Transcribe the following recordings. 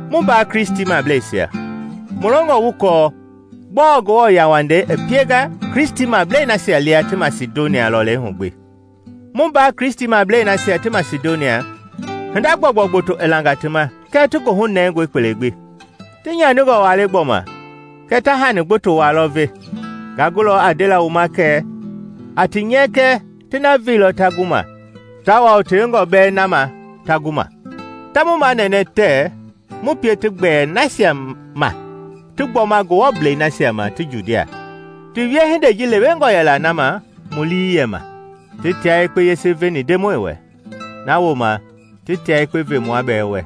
Mu mbaa Kristimableisia, mu longɔ wu kɔɔ gbɔɔ Ngewɔ yauwandei i pienga Kristimablei nasia lia ti Masidonia lɔlei hu gbi. Mu mbaa Kristimablei nasia ti Masidonia, hinda gbɔugbɔu gboto i langa ti ma kɛɛ ti goohu nɛngɔe kpele gbi. Ti nyaningɔ waa le gbɔma kɛɛ ta hani gboto waa lɔ ve. Nga gulɔ a ndela wu ma kɛ a ti nyɛkɛ ti na veilɔ ta gu ma, tawao tewengɔ bɛɛ na ma ta gu ma. Ta mu manɛnɛ tɛɛ mu pie ti gbɛɛ nasia ma ti gbɔma Ngewɔblei nasia ma ti Judia. Ti wiehindei ji lewengɔ yɛla na ma mu lii yɛ ma! Ti tia yekpe yese veni Ndemɔi wɛ; na wooma ti tia yekpe ve mua bɛɛ wɛ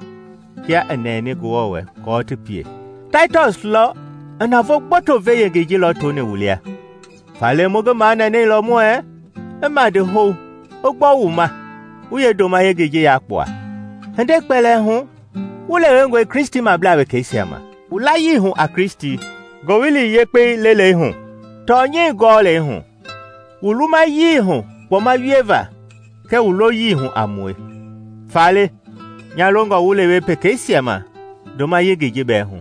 kia i nɛni Ngewɔ wɛ kɔɔ ti pie. Taitɔs lɔ i navoo gboto ve-yengei ji lɔtoni wu lia, faale mu ngi manɛnɛilɔ muɛɛ i madi hou i gbɔ wu ma wu yeendoma yengei ji yakpua. Hindei kpɛlɛɛ hu wu lewengɔe Kristimablaa wekeisia ma: wu layii hu a Kristi, Ngowili Yekpei lelei hu, tɔnyɛi gɔɔlɛi hu, wu lumayii hu kpɔma wieva kɛɛ wu loyii hu a mue. Faale nya longɔ wu lewe pekeisia ma ndoma yengei ji bɛɛ hu.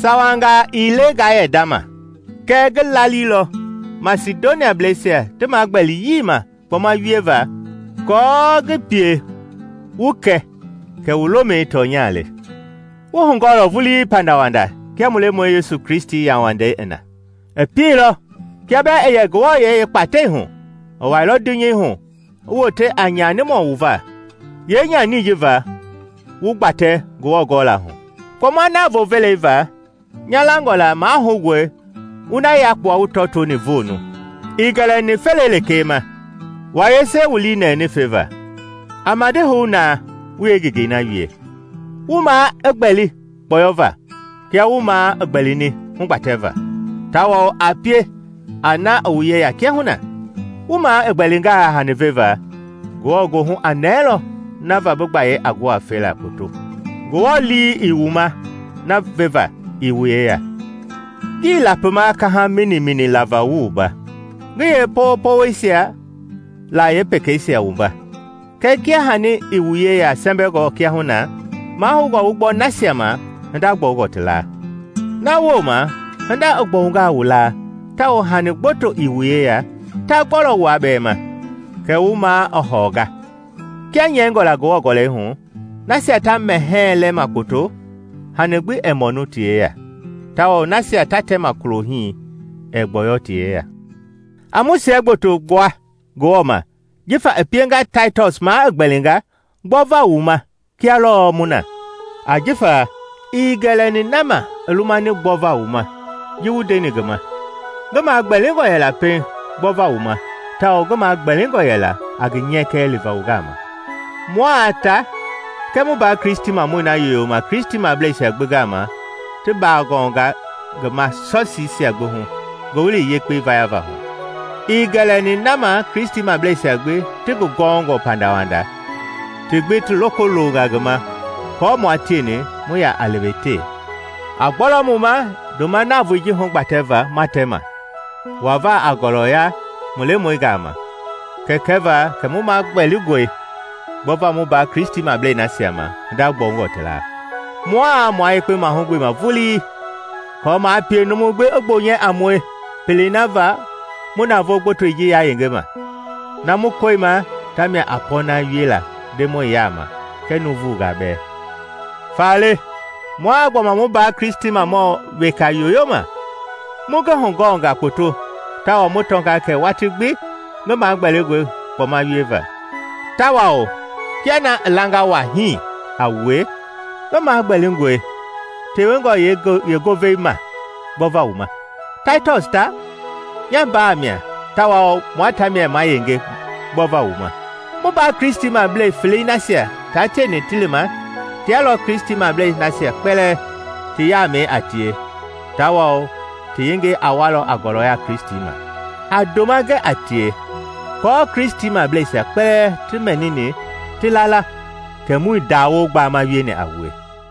Sawangaa ii le ngaa yɛ ndama. Kɛ ngi laalilɔ Masidoniableisia ti magbɛliyii ma kpɔma wieva aako ngi pie wu kɛ kɛ wu lomɛi tɔnya le. Wu hugɔɔlɔ vulii pandawanda kia mu Lemɔi Yesu Kristi yauwandei i na; i pielɔ kia bɛɛ i yɛ Ngewɔyɛi yeekpatɛi hu, i wailɔ dunyei hu i wote a nyanimɔ wu va, yeenyanii ji va wu gbatɛ Ngewɔ gɔla hu. Kpɔma navoo velei va, nya langɔ la mahoungɔe wu na yakpua wu tɔtoni voonu. Ii gɛlɛni felei lekee ma, wua yese wu lii nɛni feva. A madi hou na wu yeengengei na wie! Wu maa i gbɛli kpɔyɔva kia wu maa i gbɛlini hugbatɛva, tawao a pie a na i wu yeya kiahuna. Wu maa i gbɛlingaa hani veva, Ngewɔ goohu a nɛɛlɔ na va bi gbayei a gu a fela kpoto. Ngewɔ lii ii wu ma na veva ii wu yeya. Ngii lapima kaha minimini lava wu wumba, ngi yee powopowoisia la pekeisia wumba; kɛɛ kia hani i wu yeya sɛmbɛngɔ kiahuna, mahoungɔ wu gbɔ nasia ma hinda gbɔungɔ ti laa. Na wooma hinda i gbɔungaa wu laa tawao hani gbotongɔ ti yeya, ta gbɔlɔ wua bɛɛ ma, kɛ wu maa i hɔɔnga. Kia nyɛingɔ la Ngewɔ gɔlɛi hu, “Nasia ta mɛhɛɛ lɛma kpoto, hani gbi ɛɛ mɔnu ti yeya, tawao nasia ta tɛma kulohii ɛɛ gbɔyɔ ti yeya.” A mu siɛgboto gbua Ngewɔ ma jifa i pienga Taitɔs maa i gbɛlinga gbɔva wu ma kia lɔɔ mu na. Ajifa ii gɛlɛni na ma i lumani gbɔva wu ma ji mu ndeni ngi ma; ngi maa gbɛlingɔ yɛla pɛiŋ gbɔva wu ma tawao ngi magbɛlingɔ yɛla a ngi nyɛkɛ liva wu gama. Mua ta kɛɛ mu mbaa Kristimamɔi na yoyoma Kristimableisia gbi gama ti bagɔnga ngi ma Sɔsiisia gbi hu Ngowili Yekpei vayava hu. Ii gɛlɛni na ma Kristimableisia gbi ti ngi gɔɔngɔ pandawanda ti gbi ti loko longa ngi ma kɔɔ mua tieni mu ya a lewetewe. A gbɔlɔ mu ma ndoma navoei ji hugbatɛva ma tɛma, wava a ngɔlɔya mu Lemɔi gama, kɛɛ kɛva kɛ mu magbɛlingɔe gbɔva mu mbaa Kristimablei nasia ma hinda gbɔungɔ ti laa. Mua mua yekpe mahugbeema vulii aako maa pie numu gbi i gbonyɛ a mue pelei na va mu navoo gbotoi ji yayengema. Na mu kɔima tamia a pɔɔna wiela Ndemɔi yaama kɛɛ nuuvungaa bɛɛ. Faale mua gbɔma mu mbaa Kristimɔ weka yoyoma. Mu ngi hugɔnga kpoto tawao mu tɔnga kɛ watii gbi ngi magbɛlingɔe kpɔma wieva. Tawao kia na i langa waa hii a wue, ngi magbɛlingɔe tewengɔ yeengovei ma gbɔva wu ma. Taitɔs ta, nya mbaa mia tawao mua tamia ma yenge gbɔva wu ma; mu mbaa Kristimablei felei nasia taa tieni ti lima tia lɔ Kristimablei nasia kpɛlɛɛ ti yaamɛi a tie tawao ti yengei a walɔ a ngɔlɔya Kristi ma. A ndoma gɛ a tie aako Kristimableisia kpɛlɛɛ ti mɛni ti la la kɛ muii ndawoo gbama wieni a wue.